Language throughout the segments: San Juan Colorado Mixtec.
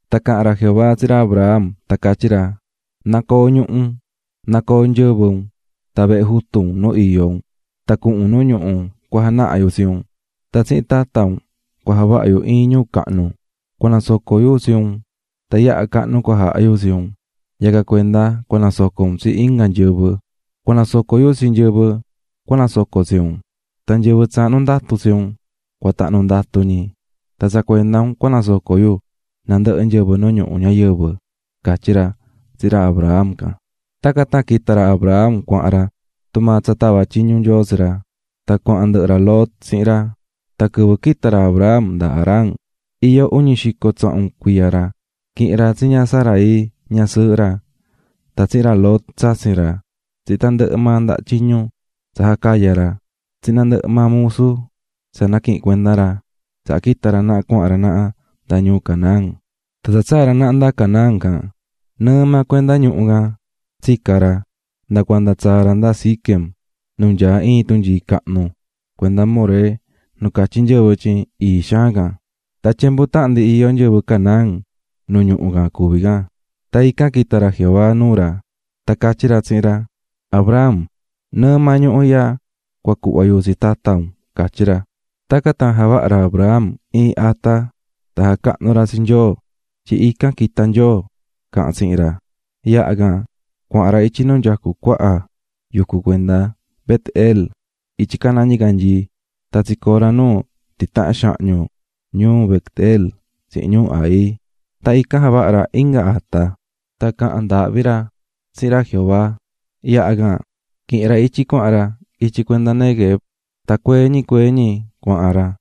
Tan caha̱n ra Jehová tsihin ra Abram, tan catyí ra: "Na̱coo ñuhu un, na̱coo nyɨvɨ un, tan vehe jutu un nu iyó un, tan cuhun un nuu ñuhu cua janaha yu tsi un. Tan tsihin tata un cua javaha yu iin ñuu cahnu, cua nasoco yu tsi un, tan yaha cahnu cua jaha yu tsi un, yacan cuenda cua nasoco un tsi inga nyɨvɨ. Cua nasoco yu tsi nyɨvɨ cua nasoco tsi un, tan nyɨvɨ cahnu ndatu tsi un, cua tahnu ndatu ñi. Tan tsa cuenda un cua nasoco yu nandɨhɨ nyɨvɨ nu ñuhu ñayɨvɨ", catyí ra tsihin ra Abram can. Tacan tan quita̱ ra Abram cuahan ra tumaa tsa tava̱ tyiñu Nyoo tsi ra, tan cuahan ndɨhɨ ra Lot tsihin ra. Tan quɨvɨ quita̱ ra Abram nda Harán, iyó uñi xico tsahun cuiya ra. Quihi̱n ra tsi ña Sarai, ñasɨɨhɨ ra, tan tsihin ra Lot, tsatsin ra, tsihin tandɨhɨ maa ndaha tyiñu tsa jacaya̱ ra, tsihin nandɨhɨ maa musu tsa naquihi̱n cuenda ra, tsaha quita̱ ra naha cuahan ra naha nda ñuu Canaán. Tan tsa tsaa̱ ra naha nda Canaán can, nɨɨ maa cuenda ñuhu can tsica̱ ra, nda cuanda tsaa̱ ra nda Siquem, nu nyaá iin tunyii cahnu cuenda More nu catyí nyɨvɨ tyin ii xaan can. Tan tyembu tahan ndi iyó nyɨvɨ Canaán nu ñuhu can cuví can. Tan ican quita̱ ra Jehová nuu ra, tan catyí ra tsihin ra: "Abram, nɨɨ maa ñuhu ihya cua cuhva yu tsi tata un", catyí ra. Tacan tan javaha̱ ra Abram iin ata tan jacahnu̱ ra tsi Nyoo tyin ican quita̱ Nyoo caha̱n ra tsihin ra. Yaha can cuahan ra ityi nu nyacú cuaha yucu cuenda Bet-el ityi caná ñicanyii. Tan tsicoo̱ ra nu titahan xahñu ñuu Bet-elf3 tsihin ñuu Hai. Tan ican javaha̱ ra inga ata, tan caha̱n ndaahvi ra tsihin ra Jehová. Yaha can, quihi̱n ra ityi cuahan tucu ra ityi cuenda Neguev, tan cuee ñi cuee ñi cuahan ra.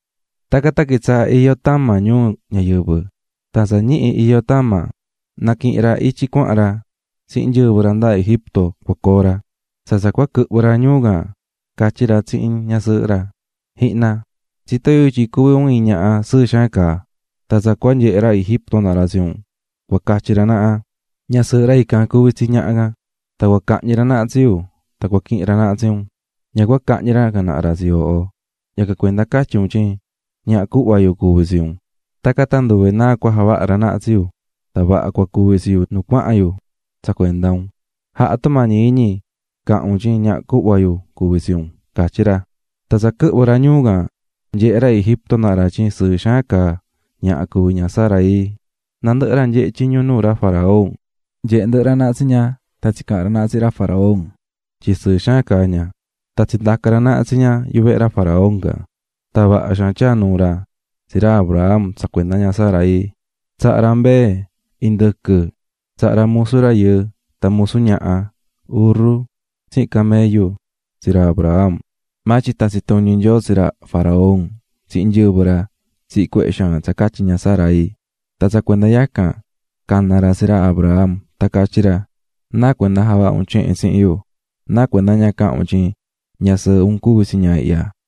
Tacan tan quitsaha̱ iyó tama ñuu ñayɨvɨ, tan tsa ñihi iyó tama, naquihi̱n ra ityi cuahan ra tsihin nyɨvɨ ra nda Egipto cua coo ra. Tsa tsa cua quɨhvɨ ra ñuu can, catyí ra tsihin ñasɨɨhɨ ra: "Ji̱hna, tsitó yu tyin cuví un iin ñaha sɨɨ xaan caá. Tan tsa cua nyehe ra Egipto naha ra tsi un, cua catyi ra naha: ꞌÑasɨɨhɨ ra ican cuví tsi ñaha canꞌ. Tan cua cahñi ra naha tsi yu, tan cua quihin ra naha tsi un, ña cua cahñi ra can naha ra tsi yooho. Yacan cuenda catyi un tyin cuhva yu cuví tsi un. Tacan tan nduve náa cua javaha ra naha tsi yu tan vaha cua cuvi tsi yu nu cuahan yo tsa cuenda un. Ja̱ha tumañi iñi, ca̱han un tyin cuhva yu cuví tsi un", catyí ra. Tsa quɨhvɨ̱ ñi ñuu can, nyehe̱ ra Egipto naha ra tyin sɨɨ xaan caá ña Sarai. Nandɨhɨ ra jacuú tyiñu nuu ra faraón, nyehe̱ ndɨhɨ ra naha tsi ña, tan tsicaha̱n ra naha tsihin ra faraón tyin sɨɨ xaan caá ña. Tan tsindaca̱ ra naha tsi ña yuvehe ra faraón can. Tan vaha xaan tyaa̱ nuu ra tsi ra Abram tsa cuenda ña Sarai. Tsaha̱ ra mbee, indɨquɨ, tsaha̱ ra musu rayɨɨ, tan musu ñaha, urru tsihin camello tsi ra Abram. Maa tyin tatsi tuñi̱ Nyoo tsi ra faraón tsihin nyɨvɨ ra tsihin cuehe xaan tsa catyi ña Sarai. Tan tsa cuenda yacan, cana̱ ra tsi ra Abram, tan catyí ra: "¿Náa cuenda javaha̱ un tsehe tsihin yu? ¿Náa cuenda ña caha̱n un tyin ñasɨɨhɨ un cuví tsi ña ihya?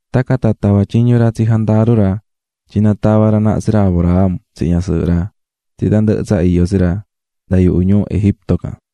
Tacan tan tava̱ tyiñu ra tsi jandaru ra tyin na tava ra naha tsi ra Abram tsihin ñasɨɨhɨ ra, tsihin tandɨhɨ tsa iyó tsi ra nda yuhu ñuu Egipto can.